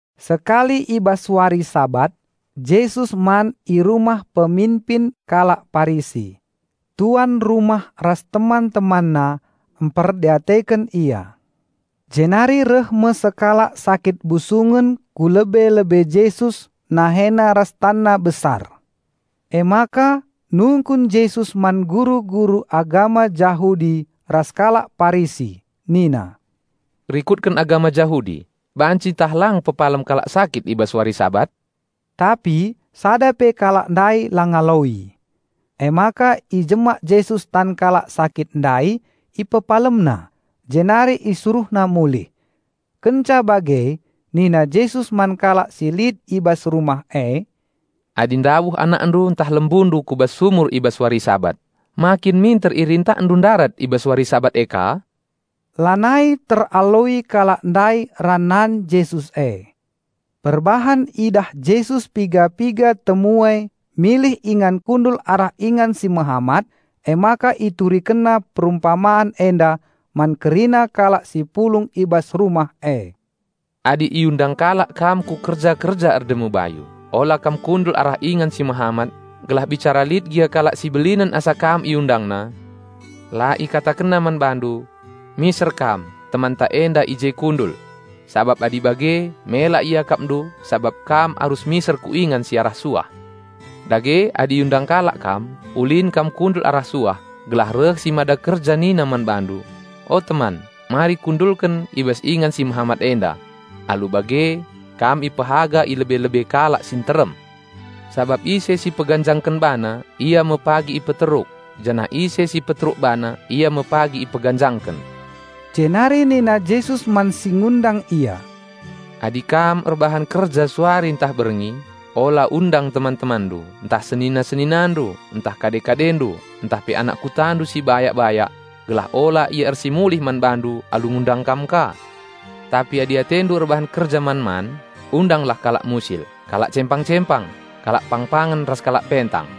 Sekali i bas wari Sabat Jesus man i rumah peminpin kalak Parisi. Tuan rumah ras teman-temanna mperdiateken Ia. Jenari reh me sekalak sakit busungen ku lebe-lebe Jesus nahena ras tanna besar. Emaka nungkun Jesus man guru-guru agama Jahudi ras kalak Parisi nina, "Rikutken agama Jahudi, banci ntah lang pepalem kalak sakit i bas wari Sabat?" Tapi sada pe kalak ndai la ngaloi. Emaka ijemak Jesus tan kalak sakit ndai, IpepalemNa, jenari IsuruhNa mulih. Kenca bage nina Jesus man kalak si lit i bas rumah e, "Adi ndabuh anakndu ntah lembundu ku bas sumur i bas wari Sabat, ma kin minter irintakndu ndarat i bas wari Sabat e ka?" Lanai teraloi kalak ndai ranan Jesus e. Perbahan idah Jesus piga-piga temue milih ingan kundul arah ingan si mehamat, emaka IturikenNa perumpaman enda man kerina kalak si pulung i bas rumah e. "Adi iundang kalak kam ku kerja-kerja erdemu bayu, ola kam kundul arah ingan si mehamat, gelah bicara lit gia kalak si belinen asa kam iundangna, la ikatakenna man bandu, 'Miser kam, temanta enda i je kundul!' Sabap adi bage mela iakapndu sabap kam arus miser ku ingan si arah suah. Dage, adi iundang kalak kam, ulin kam kundul arah suah, gelah reh si mada kerja nina man bandu, 'O, teman, mari kundulken i bas ingan si mehamat enda.' Alu bage kam ipehaga i lebe-lebe kalak si nterem. Sabap ise si peganjangken bana ia me pagi ipeteruk, janah ise si peteruk bana ia me pagi ipeganjangken." Jenari nina Jesus man si ngundang Ia, "Adi kam erbahan kerja suari ntah berngi, ola undang teman-temanndu, ntah senina-seninandu, ntah kade-kadendu, ntah pe anak kutandu si bayak-bayak gelah ola ia ersimulih man bandu alu ngundang kam ka. Tapi adi atendu erbahan kerja man-man, undanglah kalak musil, kalak cempang-cempang, kalak pangpangen ras kalak pentang,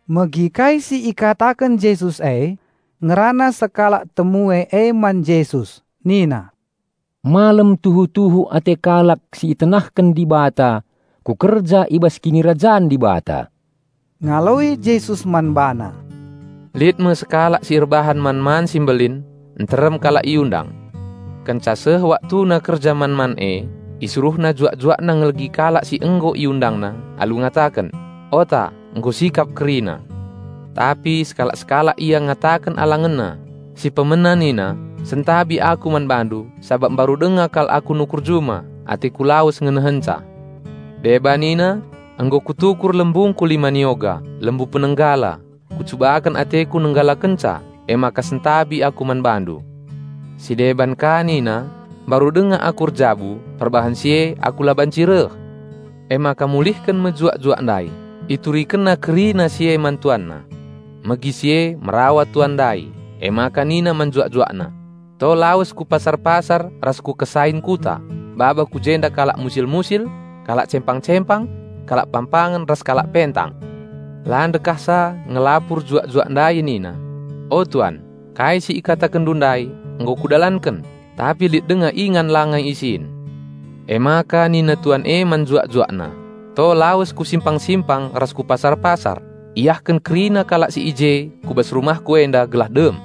Megi kai si ikataken Jesus e, ngerana sekalak temue e man Jesus nina, "Malem tuhu-tuhu ate kalak si itenahken Dibata ku kerja i bas Kinirajan Dibata." Ngaloi Jesus man bana, "Lit me sekalak si erbahan man-man si mbelin; nterem kalak iundang. Kenca seh waktuna kerja man-man e, isuruhna juak-juakna ngelegi kalak si nggo iundangna, alu ngataken, 'Ota, nggo sikap kerina!' Tapi sekalak-sekalak ia ngataken alangenna. Si pemena nina, 'Sentabi aku man bandu, sabap mbaru denga kal aku nukur juma; ateku lawes ngenehenca.' Deba nina, 'Nggo kutukur lembuku lima nioga, lembu penenggala; kucubaken ateku nenggalakenca, emaka sentabi aku man bandu.' Si deban ka nina, 'Mbaru denga aku erjabu, perbahan si e aku la banci reh.' Emaka mulihken me juak-juak ndai, iturikenna kerina si e man tuanna. Megi si e merawa tuan ndai, emaka nina man juak-juakna, 'To lawes ku pasar-pasar ras ku kesain kuta, baba ku jenda kalak musil-musil, kalak cempang-cempang, kalak pangpangen ras kalak pentang.' La ndekahsa ngelapur juak-juak ndai nina, 'O tuan, kai si ikatakenndu ndai nggo kudalanken, tapi lit denga ingan langa isin.' Emaka nina tuan e man juak-juakna, 'To lawes ku simpang-simpang ras ku pasar-pasar, iahken kerina kalak si i je ku bas rumahku enda gelah dem.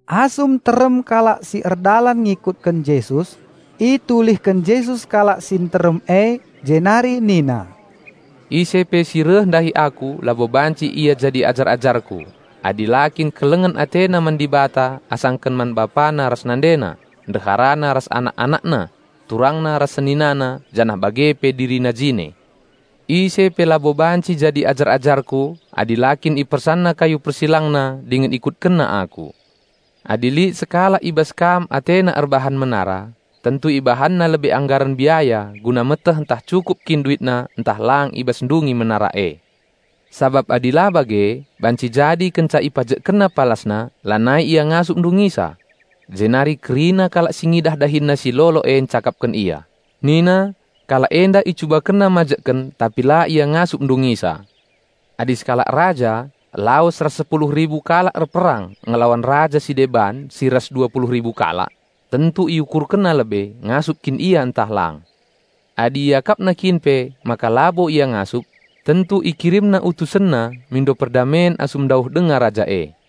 Asum nterem kalak si erdalan ngikutken Jesus, itulihken Jesus kalak si nterem e jenari nina, "Ise pe si reh ndahi Aku labo banci ia jadi ajar-ajarKu, adi la kin kelengen atena man Dibata asangken man bapana ras nandena, ndeharana ras anak-anakna, turangna ras seninana janah bage pe dirina jine. Ise pe labo banci jadi ajar-ajarku adi la kin ipersanna kayu persilangna dingen ikutkenna Aku. Adi lit sekalak i bas kam atena erbahan menara, tentu ibahanna lebe anggaren biaya guna meteh ntah cukup kin duitna ntah lang i bas ndungi menara e. Sabap adi la bage, banci jadi kenca ipajekkenna palasna, lanai ia ngasup ndungisa. Jenari kerina kalak si ngidah dahinna si lolo e ncakapken ia, nina, 'Kalak enda icubakenna mbangun, tapi la ia ngasup ndungisa!' Adi sekalak raja lawes ras sepuluh ribu kalak erperang ngelawan raja si deban si ras dua puluh ribu kalak, tentu iukurkenna lebe ngasup kin ia ntah lang. Adi iakapna kin pe maka labo ia ngasup, tentu ikirimna utusenna mindo perdamen asum ndauh denga raja e."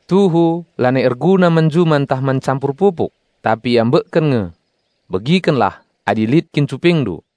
Tuhu lanai erguna man juma ntah man campur pupuk; tapi iambekken nge. Begikenlah adi lit kin cupingndu!"